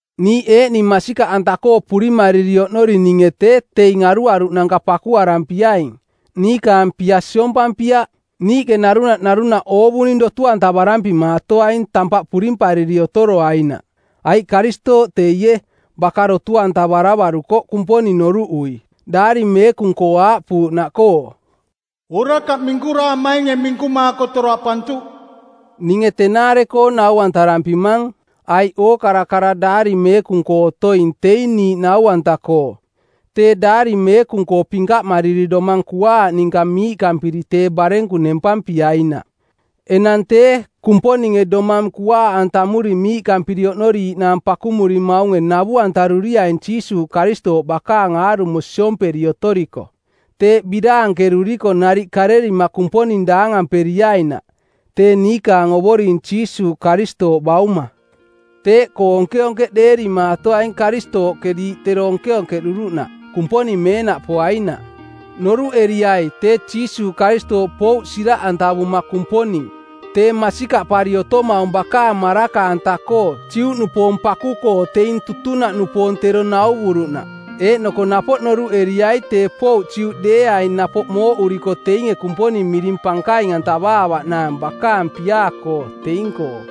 Niiꞌ eeꞌning masikaꞌanta-koo purimariri oꞌnorininge tee teing aruaruꞌnanka pakuarampiaing, niikaang pia siompampiaꞌ. Niiꞌke narunaꞌ narunaꞌ oovuning dotu-antavarampimaatoaing tampaꞌ purimpariri otoroainaꞌ. Aiꞌ Karistooꞌ teie, baka dotu-antavaravarukoꞌ Kumponing noruꞌui, Daari Meekung-koo aaꞌpuuꞌnaꞌkoo, “Orakaꞌ minkuraamainge minkumaako toraꞌpantuꞌ.” Ninge tenaare-koo noruꞌantarampimang, aiꞌ ookara kara Daari Meekung-koo otoing teing niiꞌ nau-anta-koo, tee Daari Meekung-koo pinkaꞌmariri domang kuaaꞌ ninka miiꞌkampiri tee barenku nempampiainaꞌ. Enang tee, Kumponinge domang kuaaꞌantamuri miiꞌkampiri oꞌnoriiꞌnaang pakumurimaunge navu-antaruriaing Jiisuuꞌ Karistooꞌ bakaang aarumo siomperi otoriko. Teeꞌ biraankeruriko nariꞌ karerima Kumponing daangamperiainaꞌ, tee niikaang Ovoring Jiisuuꞌ Karistooꞌ Bauma. Teeꞌkoo onkeonkeꞌdeerimaatoaing Karistooꞌke diiꞌ tero onkeonkeꞌduruꞌnaꞌ, Kumponing meenaꞌpoainaꞌ. Noruꞌeriai tee Jiisuuꞌ Karistooꞌ pouꞌ siraꞌantavuma Kumponing tee masikaꞌpari otomaung bakaang maraka-anta-koo Juꞌnupoong paku-koo teing tutunaꞌnupoong tero nauvuruꞌnaꞌ. Eeꞌnoko napoꞌ noruꞌeriai tee pouꞌ Juꞌdeeaing napoꞌ mooꞌuriko teinge Kumponing miring pankaing-antavaavaꞌnaang bakaang piaa-koo teing-koo.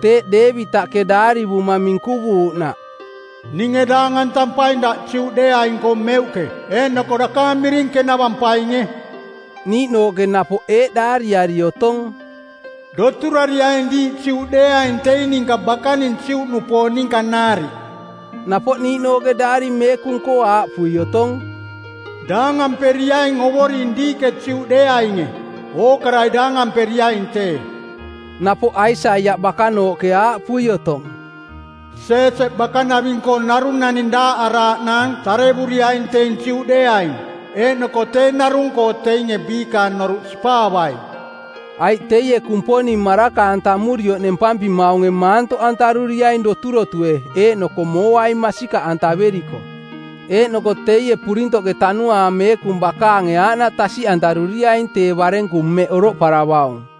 Teeꞌ Deevitaꞌke daarivuma minkuvuuꞌnaꞌ, “Ninge daangantampaing Daꞌ Juꞌdeeaing-koo meuꞌke, eeꞌnoko dakaang miring kenavampainge.” Niiꞌnooꞌke napoꞌ eeꞌ daariari otong, “Doturariaing diiꞌ Juꞌdeeaing teing ninka bakaning Juꞌnupoong ninka nariꞌ.” Napoꞌ niiꞌnooꞌke Daari Meekung-koo aaꞌpui otong, “Daangamperiaing Ovoring diiꞌke Juꞌdeeainge. Ookarai daangamperiaing tee.” Napoꞌ Aisaiaꞌ bakanooꞌke aaꞌpui otong, “Jeeseꞌ bakanaving-koo narung naning daaꞌaraaꞌnaang tarevuriaing teing Juꞌdeeaing, eeꞌnoko tee narung-koo teinge biikaang noruꞌ sipaavai.” Aiꞌ teie Kumponing maraka-antamurioꞌ nempampimaunge maantoꞌantaruriaing doturotue eeꞌnoko mooai masikaꞌantaveriko. Eeꞌnoko teie purintoꞌke Tanuaang Meekung bakaange aaꞌnaꞌ tasiꞌantaruriaing tee barenku mmeꞌ oroꞌparavaung.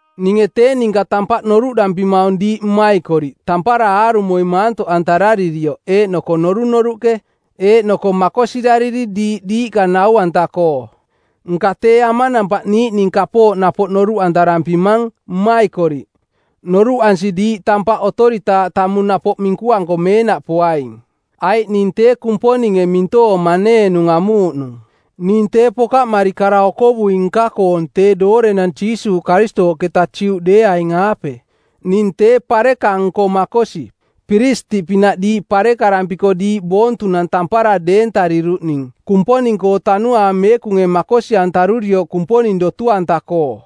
Ninge tee ninka tampaꞌ noruꞌdampimaung diiꞌ mmaikoriꞌ tampara aarumoi maantoꞌantararirioꞌ eeꞌnoko norunoruꞌke, eeꞌnoko makosirariri diiꞌ diiꞌka nau-anta-koo. Nka tee amanampaꞌ niiꞌning kapooꞌ napoꞌ noruꞌantarampimang, mmaikoriꞌ, noruꞌansi diiꞌ tampaꞌ otoritaaꞌ tamung napoꞌ minkuanko meenaꞌpoaing, aiꞌ ning tee Kumponinge mintoong maneenung amuuꞌnung. Ning tee pokaꞌmari kara-okovui-nka-koong tee doorenang Jiisuuꞌ Karistooꞌketa Juꞌdeeaing-aape. Ning tee pareka-nko makosi, piristiꞌpinaꞌ diiꞌ parekarampiko diiꞌ boontunang tampara deentariruꞌning Kumponing-koo Tanuaang Meekunge makosi-antarurioꞌ Kumponing dotu-anta-koo.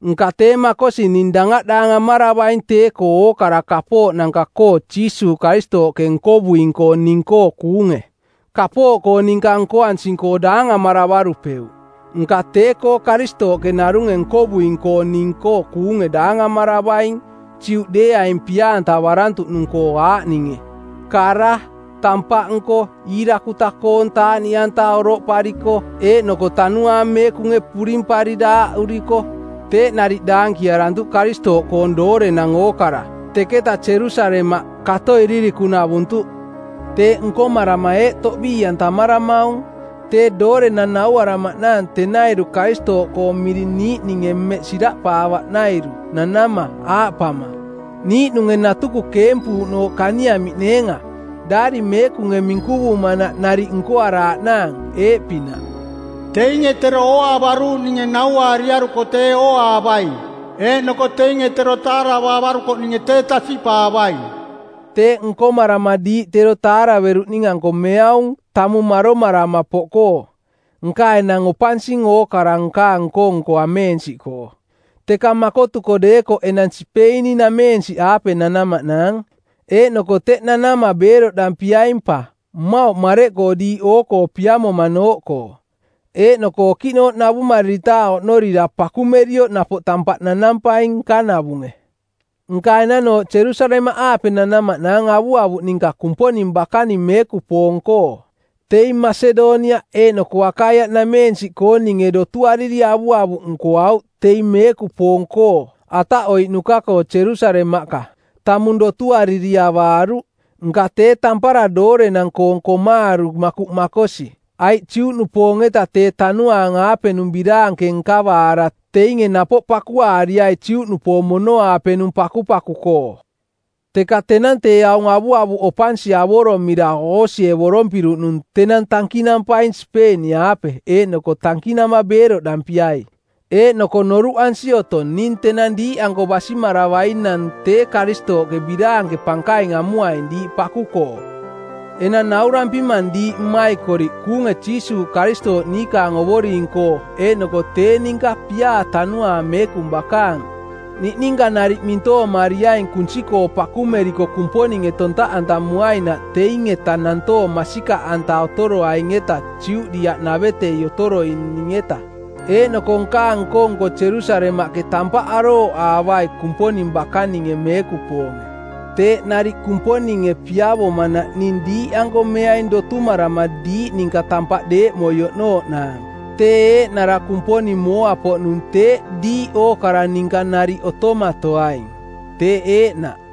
Nka tee makosi ning dangaꞌdaangamaravaing tee-koo ookara kapooꞌnanka-koo Jiisuuꞌ Karistooꞌke nkovuing-koo ning-koo kuunge. Kapooꞌkoo ninka nkoansing-koo daangamaravarupeuꞌ, nka tee-koo Karistooꞌke narunge nkovuing-koo ning-koo kuunge daangamaravaing Juꞌdeeaing pia-antavarantuꞌnung-koo aaꞌninge: kara, tampaꞌnko, iirakuta-koong taaꞌniꞌanta oroꞌpariko eeꞌnoko Tanuaang Meekunge purimpari daaꞌuriko; Teeꞌ nariꞌ daankiarantuꞌ Karistooꞌkoong doorenang ookara teketa Jerusalemaꞌ kato Ilirikung-navuntuꞌ. Teeꞌ nkomarama eeꞌ toꞌbii-antamaramaung: Tee doorenang nauaramaꞌnaang tenairu Karistooꞌkoong miring niiꞌninge mmeꞌ siraꞌpaavaꞌnairu nanama, aaꞌpama: Niiꞌnunge natuku keempuuꞌnooꞌ kaniamiꞌneenga. Daari Meekunge minkuvumanaꞌ nariꞌ nkoaraaꞌnaang eeꞌpinaꞌ, “Teinge tero ooaavaruuꞌninge nauaariaruko tee ooaavaing, eeꞌnoko teinge tero taaravaavarukoꞌninge tee tasiꞌpaavaing.” Teeꞌ nkomarama diiꞌ tero taaraveruꞌning-anko meaung tamung maromarama poꞌkoo. Nka enang opansing ookara nkaang nko-nko ameensiꞌkoo. Teka makotuko deekoꞌ enang Sipeini-nameensiꞌaape nanamaꞌnaang, eeꞌnoko teꞌ nanama beeroꞌdampiaing pa, mmauꞌ mareꞌkoo diiꞌ oo-koo piamonanooꞌkoo. Eeꞌnoko okiꞌnooꞌ navumariritaaꞌ oꞌnooꞌnorira pakumerioꞌ napoꞌ tampaꞌ nanampaing nkanavunge. Nka enanooꞌ Jerusalemaꞌaape nanamaꞌnaang avuavuꞌ ninka Kumponing bakaning meekupoong-koo. Teing Masedoniaꞌ eeꞌnoko Akaiaꞌnameensiꞌkooninge dotuariri avuavuꞌ nkoauꞌ teing meekupoong-koo ataꞌoiꞌnuka-koo Jerusalemaꞌka. Tamung dotuariri avaaruꞌ, nka tee tampara doorenang-koong komaaru makuꞌ makosi. Aiꞌ Juꞌnupoong-eta tee tanuaang-aapenung biraanke nkavaara teinge napoꞌ pakuaariai Juꞌnupoong mono-aapenung pakupaku-koo. Teka tenang tee aung avuavuꞌ opansi avoromira oosievorompiruꞌnung tenang tankinampaing Sipeini-aape eeꞌnoko tankinama beeroꞌdampiai. Eeꞌnoko noruꞌansi otong ning tenang diiꞌanko basimaravainang tee Karistooꞌke biraanke pankaing amuaing diiꞌ paku-koo. Enang naurampimang diiꞌ mmaikoriꞌ kuunge Jiisuuꞌ Karistooꞌ niikaang Ovoring-koo eeꞌnoko tee ninka piaa Tanuaang Meekung bakaang, niꞌninka nariꞌ mintoomariaing kunsi-koo pakumeriko Kumponinge tontaꞌantamuainaꞌ teing-eta nantoong masikaꞌanta otoroaing-eta Judiaꞌnavetei otoroining-eta, eeꞌnoko nkaang nko-nko Jerusalemaꞌke tampaꞌ arooꞌaavai Kumponing bakaninge meekupoonge. Teeꞌ nariꞌ Kumponinge piavomanaꞌ ning diiꞌanko meaing dotumarama diiꞌ ninka tampaꞌ deeꞌmoi oꞌnooꞌnaang. Tee eeꞌnara Kumponing mooa-poꞌnung teeꞌ diiꞌ ookara ninka nariꞌ otomatoaing. Teeꞌ eeꞌnaꞌ.